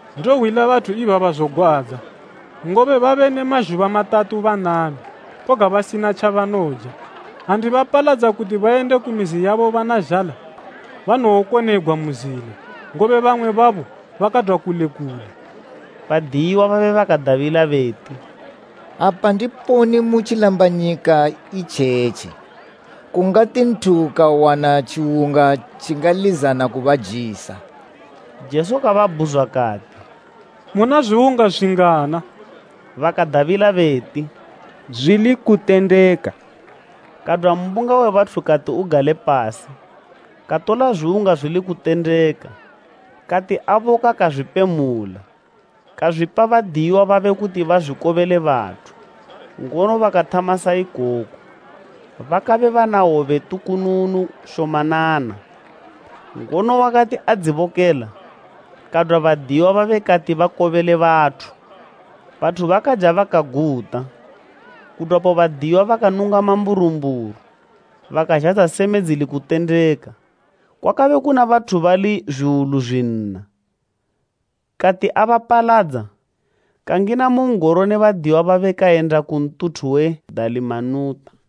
“Ndohwila bathu ibaba zogwadza, ngobe babe ne mazhuba matatu banami, koga basina tjabanoja. Ha ndibapaladza kuti bayende ku mizi yabo bana zhala, banowokonegwa mu zila, ngobe bamwe babo bakadwa kule kule.” Badiyiwa babe bakadabila beti, “Apa ndiponi mu tjilambanyika itjetji, kungati nthu kawana tjiwunga tjingalizana kubajisa?” Jesu kababhuzwa kati, “Muna zwiwunga zwingana?” Bakadabila beti, “Zwili kutendeka.” Kadwa mbunga we bathu kati ugale pasi. Katola zwiwunga zwili kutendeka, kati aboka kazwipemula, kazwipa badiyiwa babe kuti bazwikobele bathu, ngono bakathama sa ikoko. Bakabe bana hwobe tukununu shomanana. Ngono wakati adzibokela, kadwa badiyiwa babe kati bakobele bathu. Bathu bakaja bakaguta. Kudwapo badiyiwa bakanunga mamburumburu, bakazhadza seme dzili kutendeka. Kwakabe kuna bathu bali zwiwulu zwinna. Kati abapaladza, kangina mu n'goro ne badiyiwa babe kayenda ku ntuthu we Dalimanuta.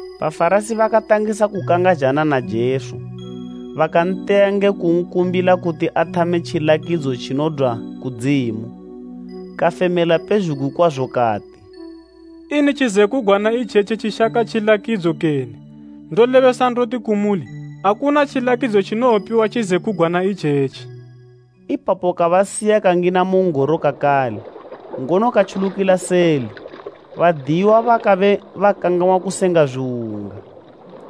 Bafarasi bakatangisa kukangazhana na Jesu, bakanteya nge kunkumbila kuti athame tjilakidzo tjinodwa kudzimu. Kafemela pezhugwi kwazo kati, “Ini tjizekugwana itjetji tjishaka tjilakidzo kene? Ndolebesa ndoti kumuli, akuna tjilakidzo tjinowopiwa tjizekugwana itjetji.” Ipapo kabasiya kangina mu n'goro kakale, ngono katjulukila seli. Badiyiwa bakabe bakangang'wa kusenga zwiwunga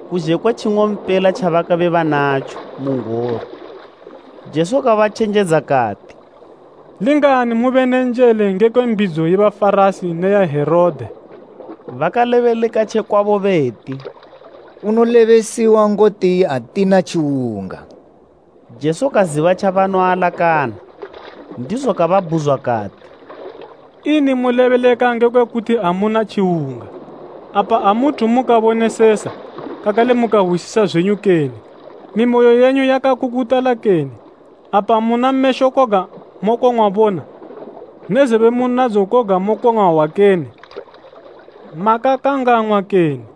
kuzhe kwe tjing'ompela tjabakabe banatjo mu n'goro. Jesu kabatjenjedza kati, “Lingani mube ne njele ngekwe mbidzo ye Bafarasi ne ya Herode.” Bakalebeleka tje kwabo beti, “Unolebesiwa ngoti atina tjiwunga.” Jesu kaziba tjabanoalakana, ndizo kababhuzwa kati, “Ini mulebeleka ngekwe kuti amuna tjiwunga? Apa amuthu mukabonesesa, kakale mukahwisisa zwenyu kene? Mimoyo yenyu yakakukutala kene? Apa muna mesho koga mokong'wa bona, ne zebe munadzo koga mokong'wa hwa kene? Makangang'wa kene?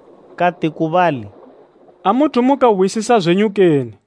Kati ku bali, “Amuthu mukahwisisa zwenyu kene?”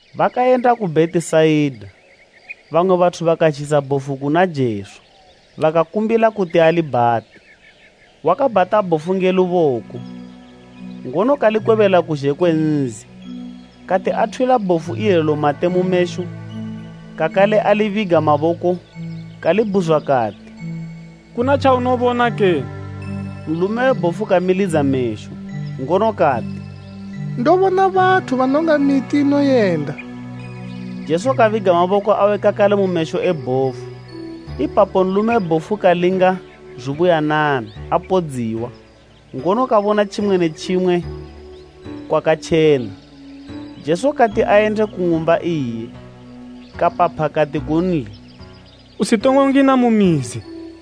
Bakayenda ku Bhetisaida, bamwe bathu bakazhisa bhofu kuna Jesu, bakakumbila kuti alibhate. Wakabhata bhofu nge luboko, ngono kalikwebela kuzhe kwe nzi, kati athwila bhofu ilelo mate mu mesho, kakale alibiga maboko kalibhuzwa kati, “Kuna tjaunobona kene?” Nlume we bhofu kamilidza mesho, ngono kati, “Ndobona bathu, banonga miti inoyenda.” Jesu kabiga maboko awe kakale mu mesho e bhofu. Ipapo nlume we bhofu kalinga zubuyanana apodziwa, ngono kabona tjimwe ne tjimwe kwakatjena. Jesu kati ayende ku ng'umba iye, kapapha kati kunli, “Usitongo ngina mu mizi.”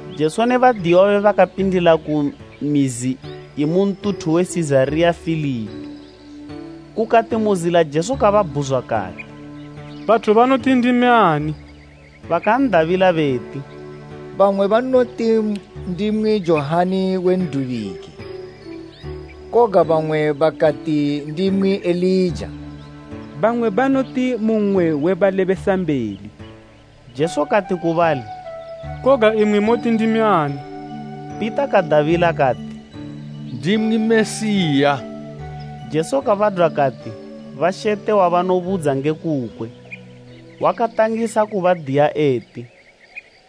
Jesu ne badiyiwa babe bakapindila ku mizi imu ntuthu we Sizariya Filipi, kukati mu zila Jesu kababhuzwa kati, “Bathu banoti ndimi ani?” Bakan'dabila beti, “Bamwe banoti ndimwi Johani we N'dubiki, koga bamwe bakati ndimwi Elija, bamwe banoti mu mmwe we balebesambeli.” Jesu kati ku bali, “Koga imwi moti ndimi ani?” Pita kadabila kati, “Ndimwi Mesiya.” Jesu kabadwa kati bashete wabanobudza nge kukwe. Wakatangisa kubadiya eti,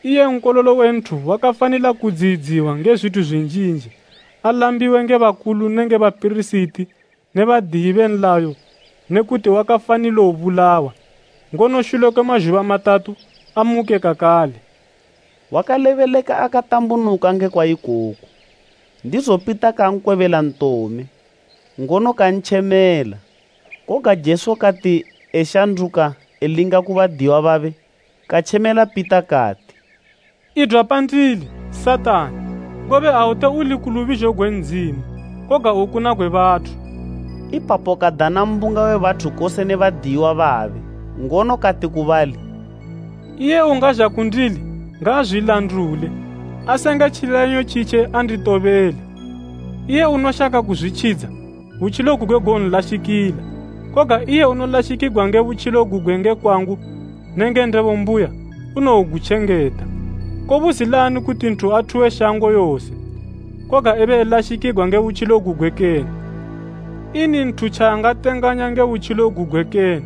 “Iye Nkololo we Nthu wakafanila kudziyidziwa nge zwithu zwinjinji alambiwe nge bakulu nenge bapirisiti ne badiyi be nlayo ne kuti wakafanilo bulawa, ngono shule kwe mazhuba matatu, amuke kakale.” Wakalebeleka akatambunuka ngekwa ikoku. Ndizo Pita kankwebela ntome, ngono kantjemela. Koga Jesu kati eshanduka elinga ku badiyiwa babe katjemela Pita kati, “Idwa pandili Satani, ngobe aute uli ku lubizho gwe Ndzimu, koga ukuna gwe bathu.” Ipapo kadana mbunga we bathu kose ne badiyiwa babe, ngono kati ku bali, “Iye ungazha kundili ngaazwilandule, asenge tjileyanyo tjitje anditobele. Iye unoshaka kuzwitjidza, butjilo gugwe gowonlashikila, koga iye unolashikigwa nge butjilo gugwe nge kwangu nenge Ndebo mbuya, unowogutjengeta. Kobuzilani kuti nthu athuwe shango yose, koga ebe elashikigwa nge butjilo gugwe kene? Ini nthu tjaangatenganya nge butjilo gugwe kene?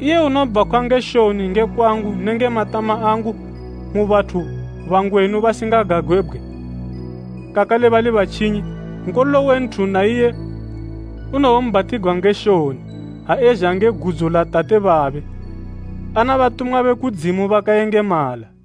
Iye unobhakhwa nge shoni nge kwangu nenge matama angu mu bathu bangwenu basingagagwebgwe, kakale bali batjinyi, Nkololo we Nthu na iye unowombhatigwa nge shoni, ha ezha nge gudzo la Tate babe, ana batumwa be kudzimu bakayengemala.”